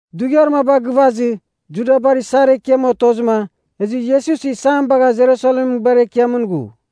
Dughiar maba gɨvazɨ, Judabar isar ekiam otozɨma, ezɨ Iesus isam bagha Jerusalemɨn nguibar ekiamɨn ghu.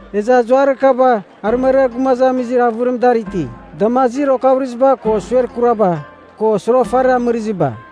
Ezɨ azuarir kaba arɨmariar gumazamizir avɨrim dar iti, damazir okavɨrɨziba ko suer kuraba, ko soroghafariba amɨraziba.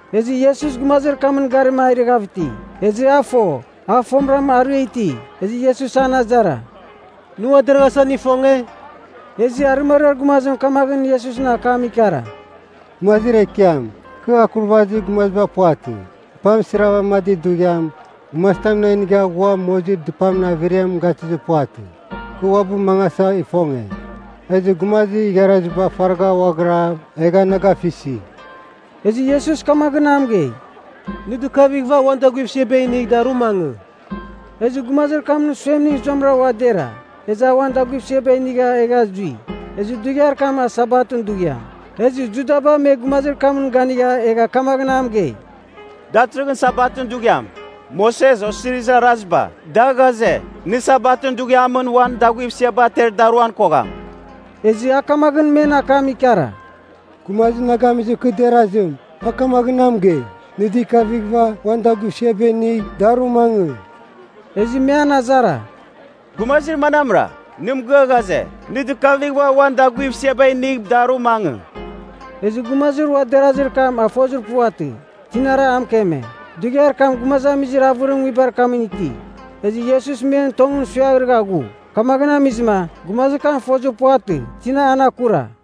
Ezɨ Iesus gumazir kamɨn garima a irɨghav iti, ezɨ a fo, a fomɨram arɨa iti. Ezɨ Iesus an azara, “Nɨ ua deraghasa nɨ ifonge?” Ezɨ arɨmariar gumazim kamaghɨn Iesusɨn akam ikara, “Gumazir ekiam, kɨ akurvazir gumaziba puvatɨ. Dɨpam sɨrvamadir dughiam, gumazitam na inigha ghua mozir dɨpamɨn averiam gatɨzir puvatɨ. Kɨ uabɨ mangasa ifonge, ezɨ gumazir igharaziba faragha ghuaghira egha na gafisi.” Ezɨ Iesus kamaghɨn a mɨgei, “Nɨ dɨkavighɨva uan daguivsiaba inigh, daru mangɨ.” Ezɨ gumazir kamɨn suemning zuamɨra ua dera. Ezɨ a uan daguivsiaba inigha egha zui. Ezɨ dughiar kam a Sabatɨn dughiam, ezɨ Judaba me gumazir kamɨn ganigha egha kamaghɨn a mɨgei, “Datɨrɨghɨn Sabatɨn dughiam. Moses Osirizir Araziba, da ghaze, nɨ Sabatɨn dughiamɨn uan daguivsiaba ater daruan kogham.” Ezɨ a kamaghɨn men akam ikara, “Gumazir na gamizɨma kɨ derazim, a kamaghɨn na mɨgei, ‘Nɨ dɨkavighɨva uan daguivsiaba inigh, daru mangɨ.’” Ezɨ me an azara, “Gumazir manamra, nɨ mɨgɨa ghaze, ‘Nɨ dɨkavighɨva uan daguivsiaba inigh, daru mangɨ.’” Ezɨ gumazir ua derazir kam a fozir puvatɨ, tinara a mɨkeme. Dughiar kam gumazamizir avɨrim nguibar kamɨn iti, ezɨ Iesus men tongɨn suiaghrɨgha ghu. Kamaghɨn amizɨma, gumazir kam fozir puvatɨ, tina an akura.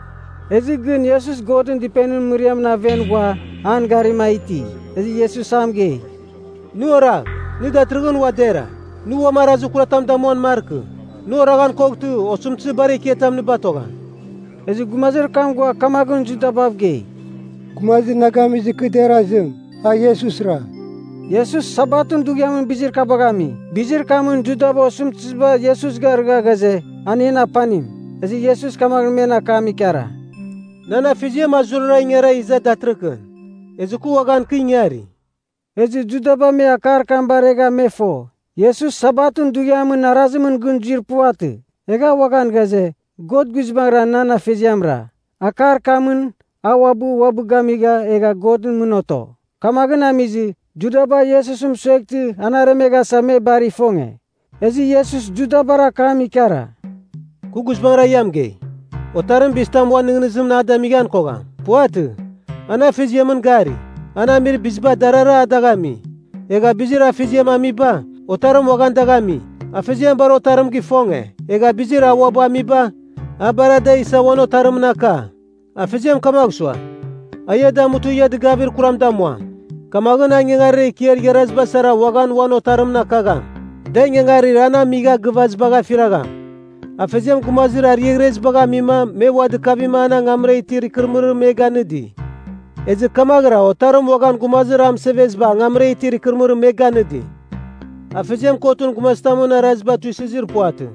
Ezɨ gɨn Iesus Godɨn dɨpenimɨn mɨriamɨn aven ghua an garima a iti. Ezɨ Iesus a mɨgei, “Nɨ oragh. Nɨ datɨrɨghɨn ua dera. Nɨ uam arazir kuratam damuan markɨ. Nɨ oraghan koghtɨ, osɨmtɨzir bar ekiatam nɨ batogham.” Ezɨ gumazir kam ghua kamaghɨn Judabav gei, “Gumazir na gamizɨ kɨ derazim, a Iesusra.” Iesus Sabatɨn dughiamɨn bizir kabagh ami, bizir kamɨn Judaba osɨmtɨziba Iesus garɨgha ghaze, an en apanim. Ezɨ Iesus kamaghɨn men akam ikara, “Nan Afeziam a zurara ingara iza datɨrɨkɨn. Ezɨ kɨ uaghan kɨ ingari.” Ezɨ Judaba me akar kam baregha me fo, Iesus Sabatɨn dughiamɨn Arazimɨn gɨn zuir puvatɨ, egha a uaghan ghaze, God guizbangɨra nan Afeziamra. Akar kamɨn, a uabɨ uabɨ gamigha egha Godɨn mɨn oto. Kamaghɨn amizɨ, Judaba Iesus mɨsueghtɨ an aremeghasa me bar ifonge. Ezɨ Iesus Judabar akam ikara, “Kɨ guizbangɨra ia mɨgei, Otarim bizitam a uan nɨghnɨzimɨn a damighan kogham. Puvatɨ. An Afeziamɨn gari, an amir biziba darara a dagh ami. Egha bizir Afeziam amiba, Otarim uaghan dagh ami. Afeziam bar Otarim gifonge, egha bizir a uabɨ amiba, a bar ada isa uan Otarimɨn aka. Afeziam kamagh sua, a ia damutɨ ia dɨgavir kuram damuam, kamaghɨn a ingangarir ekiar igharaziba sara uaghan uan Otarimɨn akagham, da ingangarir an amigha gɨvazibagh afiragham. Afeziam gumazir ariaghrezibagh amima me ua dɨkavima an angamra itir ikɨrɨmɨrim me ganɨdi. Ezɨ kamaghɨra Otarim uaghan gumazir a mɨseveziba angamra itir ikɨrɨmɨrim me ganɨdi. Afeziam kotɨn gumazitamɨn araziba tuisɨzir puvatɨ.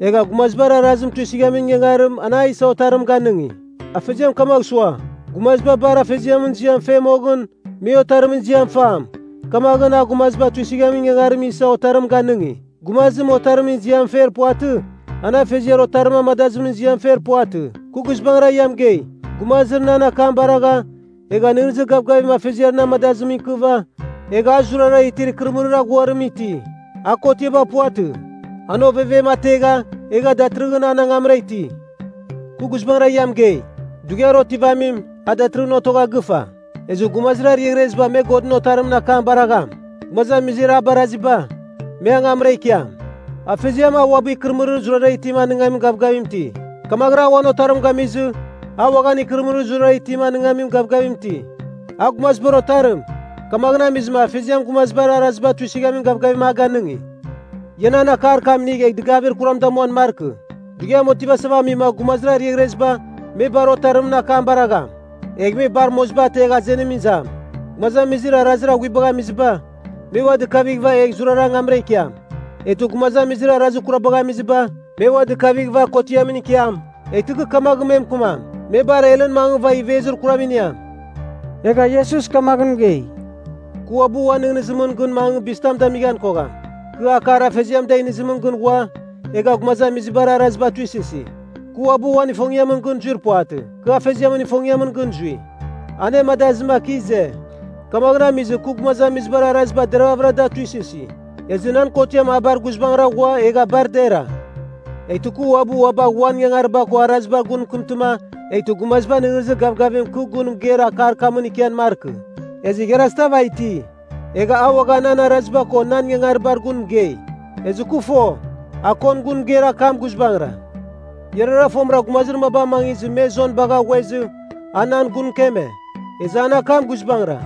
Egha gumazibar araziba tuisɨghamin ingangarim, an a isa Otarim ganɨngi. Afeziam kamagh sua, gumaziba bar Afeziamɨn ziam fe moghɨn, me Otarimɨn ziam fam, kamaghɨn a gumaziba tuisɨghamin ingangarim isa Otarim ganɨngi. Gumazim Otarimɨn ziam fer puvatɨ, an Afeziar Otarim amadazimɨn ziam fer puvatɨ. “Kɨ guizbangɨra ia mɨgei, gumazim nan akam baragha, egha nɨghnɨzir gavgavim Afeziar na amadazimɨn ikiava, egha a zurara itir ikɨrɨmɨrir aghuarim iti. A kotiaba puvatɨ. An ovevem ategha, egha datɨrɨghɨn an angamra iti. “Kɨ guizbangɨra ia mɨgei, dughiar otivamim, a datɨrɨghɨn otogha gɨfa. Ezɨ gumazir ariaghreziba me Godɨn Otarimɨn akam baragham. Gumazamizir a baraghiziba, me angamra ikiam. Afeziam, a uabɨ ikɨrɨmɨrir zurara itim anɨngamin gavgavim iti. Kamaghɨra a uan Otarim gamizɨ, a uaghan ikɨrɨmɨrir zurara itim anɨngamin gavgavim iti. A Gumazibar Otarim, kamaghɨn amizɨma Afeziam gumazibar araziba tuisɨghamin gavgavim a ganɨngi. Ia nan akar kam inigh egh dɨgavir kuram damuan markɨ. Dughiam otivasava amima gumazir ariaghreziba, me bar Otarimɨn akam baragham. Egh me bar moziba ategh azenimɨn izam. Gumazamizir arazir aghuibagh amiziba, me ua dɨkavighɨva egh zurara angamra ikiam. Eghtɨ gumazamizir arazir kurabagh amiziba, me ua dɨkavighɨva kotiamɨn ikiam, eghtɨ kɨ kamaghɨn me mɨkɨmam, me bar helɨn mangɨva ivezir kuram iniam.” Egha Iesus kamaghɨn mɨgei, “Kɨ uabɨ uan nɨghnɨzimɨn gɨn mangɨ bizitam damighan kogham. Kɨ akar Afeziam da inizimɨn gɨn ghua, egha gumazamizibar araziba tuisɨsi. Kɨ uabɨ uan ifongiamɨn gɨn zuir puvatɨ. Kɨ Afeziamɨn ifongiamɨn gɨn zui, anemadazɨma kɨ ize. Kamaghɨn amizɨ, kɨ gumazamizibar araziba deravɨra da tuisɨsi, ezɨ nan kotiam a bar guizbangɨra ghua egha bar dera. “Eghtɨ kɨ uabɨ ua bagh uan ingangariba ko arazibar gun mɨkɨmtɨma eghtɨ gumaziba nɨghnɨzir gavgavim kɨ gun mɨgeir akar kamɨn ikian markɨ. Ezɨ igharazitav a iti, egha a uaghan nan araziba ko nan ingangaribar gun mɨgei. Ezɨ kɨ fo, a kon gun mɨgeir akam guizbangɨra. “Iarara fomɨra gumazir maba amangizɨ me Jon bagha ghuezɨ a nan gun mɨkeme, ezɨ an akam guizbangɨra.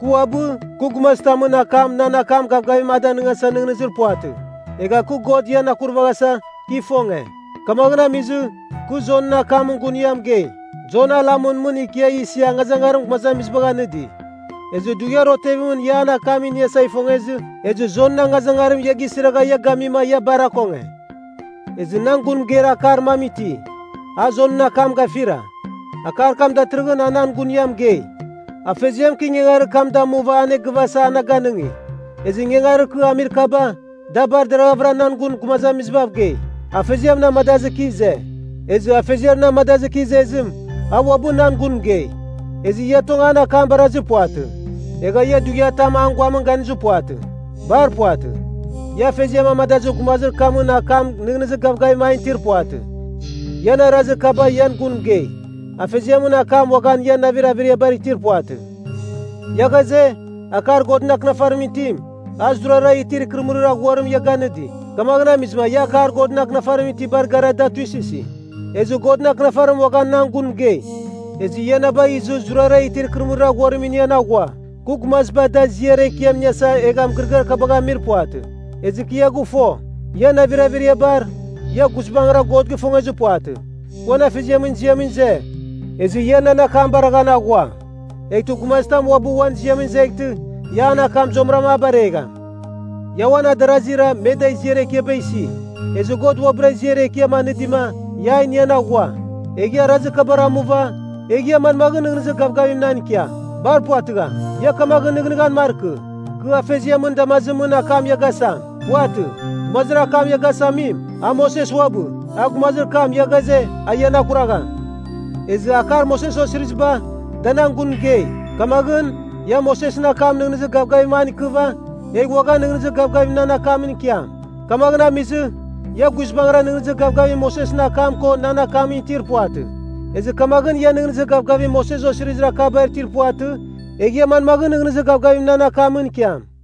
Kɨ uabɨ, kɨ gumazitamɨn akam nan akam gavgavim a danɨngasa nɨghnɨzir puvatɨ. Egha kɨ God ian akurvaghasa, kɨ ifonge. Kamaghɨn amizɨ, kɨ Jonɨn akamɨn gun ia mɨgei. Jon a lamɨn mɨn ikia isia angazangarim gumazamizibagh anɨdi. Ezɨ dughiar otevimɨn ia an akam iniasa ifongezɨ ezɨ Jonɨn angazangarim ia gisiragha ia gamima ia bar akonge. “Ezɨ nan gun mɨgeir akar mam iti, a Jonɨn akam gafira, akar kam datɨrɨghɨn a nan gun ia mɨgei. Afeziam, kɨ ingangarir kam damuva egh anegɨvasa, na ganɨngi. Ezɨ ingangarir kɨ amir kaba, da bar deraghavɨra nan gun gumazamizibav mɨgei, Afeziam na amadazɨ kɨ ize. Ezɨ Afeziar na amadazɨ kɨ izezim, a uabɨ nan gun mɨgei. Ezɨ ia tong an akam barazir puvatɨ. Egha ia dughiatam an guamɨn ganizir puvatɨ. Bar puvatɨ. Ia Afeziam amadazir gumazir kamɨn akam nɨghnɨzir gavgavim an itir puvatɨ. Ian arazir kaba ian gun mɨgei, Afeziamɨn akam uaghan ian navir averiabar itir puvatɨ. Ia ghaze, akar Godɨn Akɨnafarimɨn itim, a zurara itir ikɨrɨmɨrir aghuarim ia ganɨdi. Kamaghɨn amizɨma ia akar Godɨn Akɨnafarimɨn itibar gara da tuisɨsi. Ezɨ Godɨn Akɨnafarim uaghan nan gun mɨgei! Ezɨ ia na bagh izɨ zurara itir ikɨrɨmɨrir aghuarim inian aghua. “Kɨ gumaziba da ziar ekiam iniasa, egha mɨgɨrɨgɨar kabagh amir puvatɨ. Ezɨ kɨ ia gɨfo. Ian navir averiabar, ia guizbangɨra God gifongezir puvatɨ. Kɨ uan Afeziamɨn ziamɨn ize, ezɨ ia nan akam baraghan aghua. Eghtɨ gumazitam uabɨ uan ziamɨn izeghtɨ, ia an akam zuamɨram a baregham. Ia uan adarazira me da ziar ekiaba isi. Ezɨ God uabɨra ziar ekiam anɨdima, ia a inian aghua. Egh ia arazir kabar amuva, egh ia manmaghɨn nɨghnɨzir gavgavim nan ikiam? Bar puvatɨgham! “Ia kamaghɨn nɨghnɨghan markɨ, kɨ Afeziamɨn damazimɨn akam ia gasam. Puvatɨ. Gumazir akam ia gasamim, a Moses uabɨ, a gumazir kam ia ghaze, a ian akuragham. Ezɨ akar Moses osiriziba, da nan gun mɨgei. Kamaghɨn, ia Mosesɨn akam nɨghnɨzir gavgavim an ikɨva, egh uaghan nɨghnɨzir gavgavim nan akamɨn ikiam. Kamaghɨn amizɨ, ia guizbangɨra nɨghnɨzir gavgavim Mosesɨn akam ko nan akamɨn itir puvatɨ. Ezɨ kamaghɨn ia nɨghnɨzir gavgavim Moses osirizir akabar itir puvatɨ, egh ia manmaghɨn nɨghnɨzir gavgavim na akamɨn ikiam?”